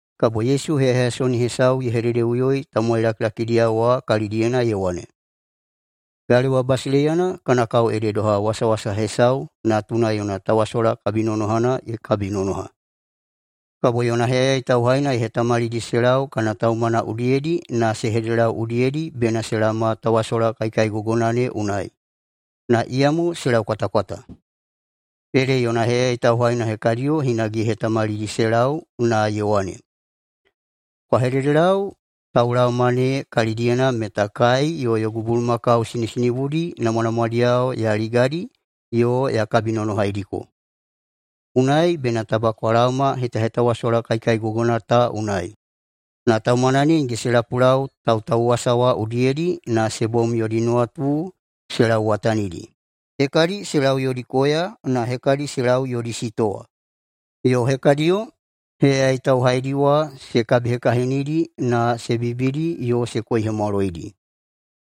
Kabo Yesu heyaheyasoni hesau ye hededeꞌuyoi tamowai lakilakidiyao wa kalidiyena ye wane, “Galewa basileiyana kana kao ede doha wasawasa hesau natuna yona tawasola kabinonohana ye kabinonoha. Kabo yona heyayai tauhaina ye hetamalidi se lau kana taumana udiyedi na se hededelau udiyedi bena se laoma tawasola kaikaigogona ne unai, na iyamo se laukwatakwata. Ede yona heyayai tauhaina hekadiyo hinage ye hetamalidi se lau na ye wane, ‘Kwa hededelau taulaoma ne kalidiyena meta kai yo yogu bulumakau sinisinibudi namwanamwadiyao ya ligadi yo ya kabinonohaidiko. Unai bena taba kwa laoma hetahetawasola kaikaigogona ta unai.’ Na taumana ne nige se lapulau tautauwasa wa udiyedi na se bom mo yodi nuwatu se lauwatanidi, hekadi se lau yodi koya na hekadi se lau yodi sitowa. Yo hekadiyo heyayai tauhaidi wa se kabihekahinidi na se bibidi yo se koihemwaloidi.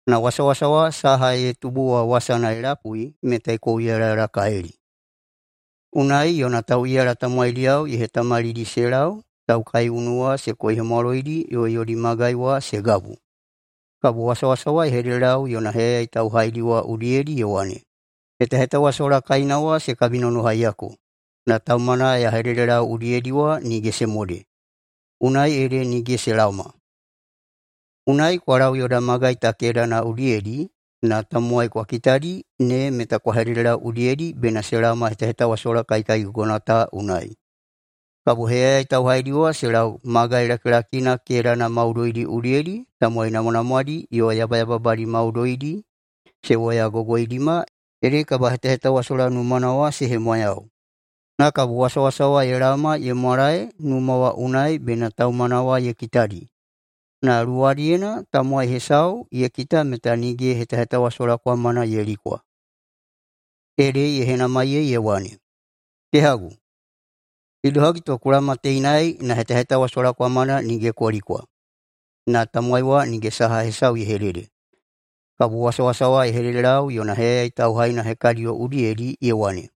Na wasawasa wa saha ye tubu wa wasana ye lapui meta ye kouyalayalakalili. Unai yona tauꞌiyala tamowaidiyao ye hetamalidi se lau taukaiunu wa se koihemwaloidi yo yodi magai wa se gabu. Kabo wasawasa wa ye hededelau yona heyayai tauhaidi wa udiyedi ye wane, ‘Hetahetawasola kaina wa se kabinonohaiyako, na taumana ya hededelau udiyedi wa nige se mode, unai ede nige se laoma. Unai kwa lau yoda magai ta kedana udiyedi na tamowai kwa kitadi ne meta kwa hededelau udiyedi bena se laoma hetahetawasola kaikaigogona ta unai.’ Kabo heyayai tauhaidi wa se lau magai lakilakina kedana maudoidi udiyedi tamowai namwanamwadi yo yabayababadi maudoidi se woyagogoidima ede kabahetahetawasola numana wa se hemwayau. Na kabo wasawasa wa ye laoma ye mwalae numa wa unai bena taumana wa ye kitadi, na luwadiyena tamowai hesau ye kita meta nige hetahetawasola kwamana ye likwa. Ede ye henamaiyei ye wane, ‘Kehagu, idohagi to ku laoma teinai na hetahetawasola kwamana nige ku likwa?’ Na tamowai wa nige saha hesau ye hedede. Kabo wasawasa wa ye hededelau yona heyayai tauhaina hekadiyo udiyedi ye wane,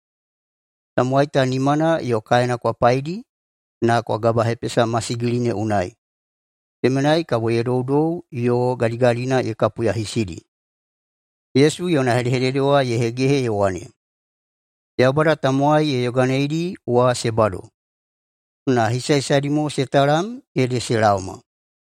‘Tamowai ta nimana yo kaena kwa paidi na kwa gabahepesa masigili ne unai, temenai kabo ye doudou yo gadigadina ye kapuyahisidi.’” [Yesu yona hedehedede wa ye hegehe ye wane], “Yaubada tamowai ye yoganeidi wa se bado, na hisahisadi mo se talam ede se laoma.”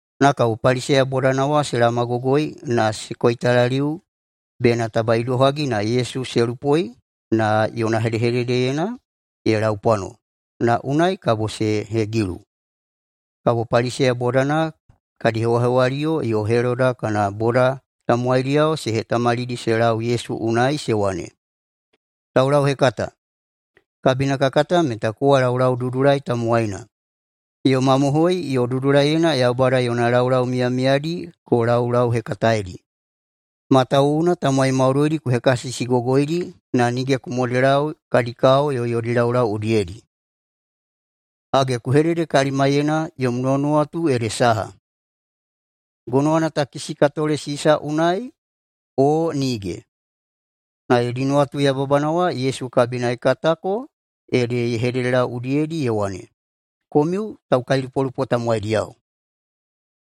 Na kabo Paliseya bodana wa se laomagogoi na se koitalaliu bena taba idohagi na kabo Yesu se lupoi na yona hedehededeyena ye laupwano, na unai kabo se hegilu. Kabo Paliseya bodana kadi hewahewaliyo yo Heloda kana boda tamowaidiyao se hetamalidi se lau Yesu unai, se wane, “Taulauhekata, kabina ka kata meta kowa laulaududulai tamowaina yo mamohoi yo dudulaiyena Yaubada yona laulau miyamiyadi ku laulauhekataedi, matawuwuna tamowai maudoidi ku hekasisigogoidi na nige ku modelau kadi kao yo yodi laulau udiyedi. Hage, ku hedede kalimaiyena yom nuwanuwatu ede saha: Gonowana takisi ka tole Sisa unai, o nige?” Na yodi nuwatu yababana wa Yesu kabina ye katako ede ye hededelau udiyedi ye wane, “Komiu taukailupolupo tamowaidiyao.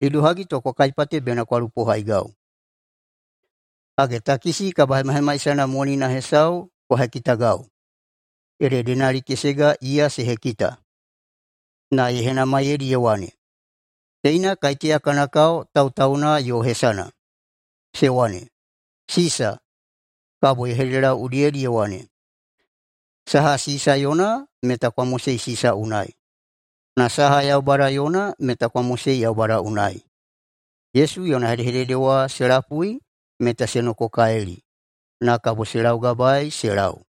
Idohagi to kwa kaipate bena kwa lupohaigau? Hage, takisi kabahemahemaisana monina hesau kwa hekitagau.” Ede denali kesega iya se hekita. Na ye henamaiyeidi ye wane, “Teina kaiteya kana kao tautauna yo hesana?” Se wane, “Sisa.” Kabo ye hededelau udiyedi ye wane, “Saha Sisa yona meta kwa mosei Sisa unai, na saha Yaubada yona meta kwa mosei Yaubada unai.” Yesu yona hedehedede wa se lapui meta se nokokalili. Na kabo se laugabaei se lau.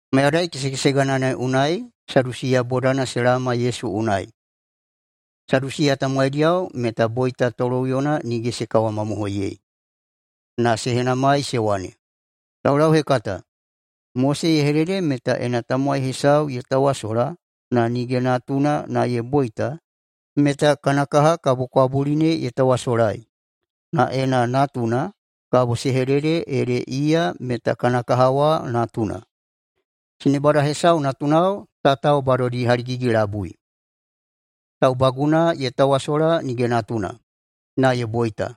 Mayadai kesekesegana ne unai Sadusiya bodana se laoma Yesu unai. Sadusiya tamowaidiyao meta boita toloꞌuyona nige se kawamamohoiyei. Na se henamaiyei se wane, “Taulauhekata, Mose ye hedede meta ena tamowai hesau ye tawasola na nige natuna na ye boita, meta kana kaha kabo kwabuli ne ye tawasolai. Na ena natuna kabo se hedede ede iya meta kana kaha wa natuna. Sinebada hesau natunao tatao badodi haligigi-labui. Taubaguna ye tawasola nige natuna, na ye boita,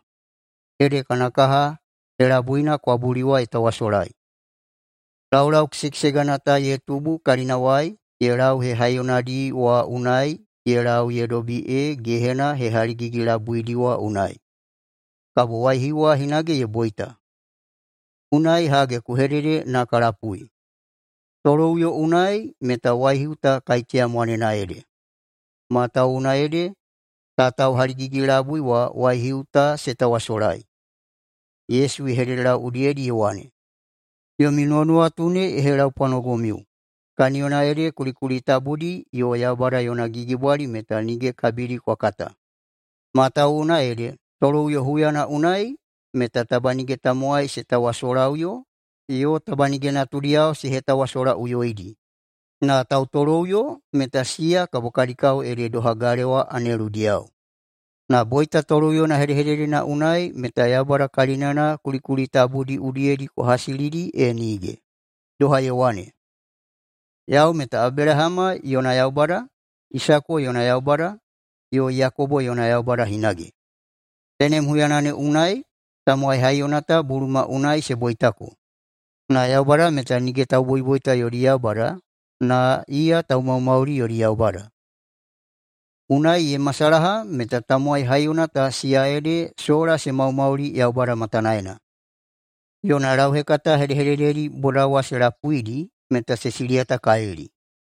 ede kana kaha helabuina kwabuli wa ye tawasolai. Laulau kesekesegana ta ye tubu kalinawai ye lau hehaiyonadi wa unai ye lau ye dobi ee gehena hehaligigi-labuidi wa unai, kabo waihiu wa hinage ye boita. Unai [hage ku hedede na ka lapui:] Toloꞌuyo unai meta waihiu ta kaiteya mwanena ede? Matawuwuna ede tatao haligigi-labui wa waihiu ta se tawasolai.” Yesu ye hededelau udiyedi ye wane, “Yomi nuwanuwatu ne ye helaupwanogomiu, kaniyona ede kulikuli tabudi yo Yaubada yona gigibwali meta nige kabidi kwa kata. Matawuwuna ede toloꞌuyo huyana unai meta taba nige tamowai se tawasolaꞌuyo, yo taba nige natudiyao se hetawasolaꞌuyoidi, na tautoloꞌuyo meta siya kabo kadi kao ede doha galewa aneludiyao. Na boita toloꞌuyona hedehededena unai meta Yaubada kalinana kulikuli tabudi udiyedi kwa hasilidi e nige, doha ye wane, ‘Yau meta Abelahama yona Yaubada, Isako yona Yaubada, yo Yakobo yona Yaubada hinage.’ [Tenem huyana ne unai tamowai haiyona ta buluma unai se boitako.] Na Yaubada meta nige tauboiboita yodi Yaubada, na iya taumaumauli yodi Yaubada. [Unai ye masalaha meta tamowai haiyona ta siya ede sola se maumauli Yaubada matanaena.]” Yona lauhekata hedehedededi boda wa se lapuidi meta se siliyatakalili.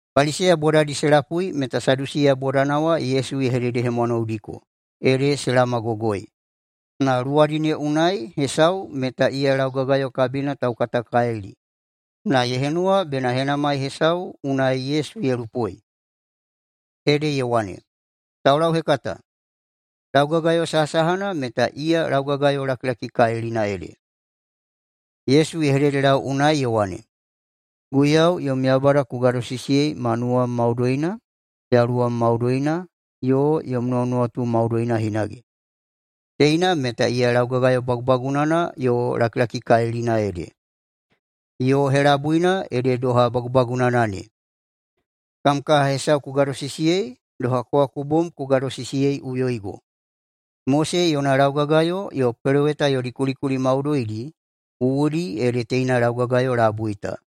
Paliseya bodadi se lapui meta Sadusiya bodana wa Yesu ye hededehemwanoudiko ede se laomagogoi, na luwadi ne unai hesau meta iya laugagayo kabina taukatakalili na ye henuwa bena henamai hesau unai Yesu ye lupoi. Ede ye wane, “Taulauhekata, laugagayo sahasahana meta iya laugagayo lakilakikalilina ede?” Yesu ye hededelau unai ye wane, “Guiyau yom Yaubada ku gadosisiyei ma nuwam maudoina, yaluwam maudoina, yo yom nuwanuwatu maudoina hinage. Teina meta iya laugagayo bagubagunana yo lakilakikalilina ede. Yo helabuina ede doha bagubagunana ne: Kam kaha hesau ku gadosisiyei doha kowa ku bom ku gadosisiyeiꞌuyoigo. Mose yona laugagayo yo peloweta yodi kulikuli maudoidi wuwudi ede teina laugagayo labui ta.”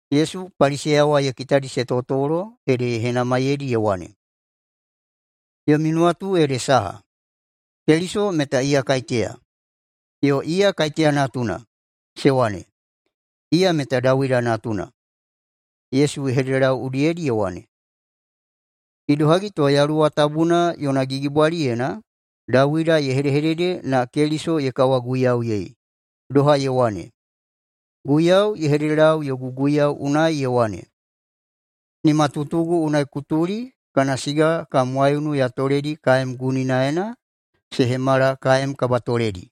Yesu Paliseya wa ye kitadi se totolo ede ye henamaiyeidi ye wane, “Yomi nuwatu ede saha, Keliso meta iya kaiteya? Yo iya kaiteya natuna?” Se wane, “Iya meta Dawida natuna.” Yesu ye hededelau udiyedi ye wane, “Idohagi to Yaluwa Tabuna yona gigibwaliyena Dawida ye hedehedede na Keliso ye kawaguiyauyei? Doha ye wane, ‘Guiyau ye hededelau yogu guiyau unai ye wane, “Nimatutugu unai ku tuli kana siga kam waiunu ya toledi kaem guninaena se hemala kaem kabatoledi.” ’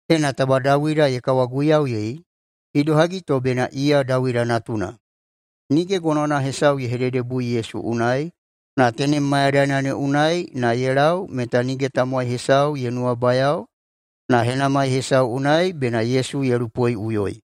Ena taba Dawida ye kawaguiyauyei, idohagi to bena iya Dawida natuna?” Nige gonowana hesau ye hededebui Yesu unai, na tenem mayadaina ne unai na ye lau meta nige tamowai hesau ye nuwabayao na henamai hesau unai bena Yesu ye lupoiꞌuyoi.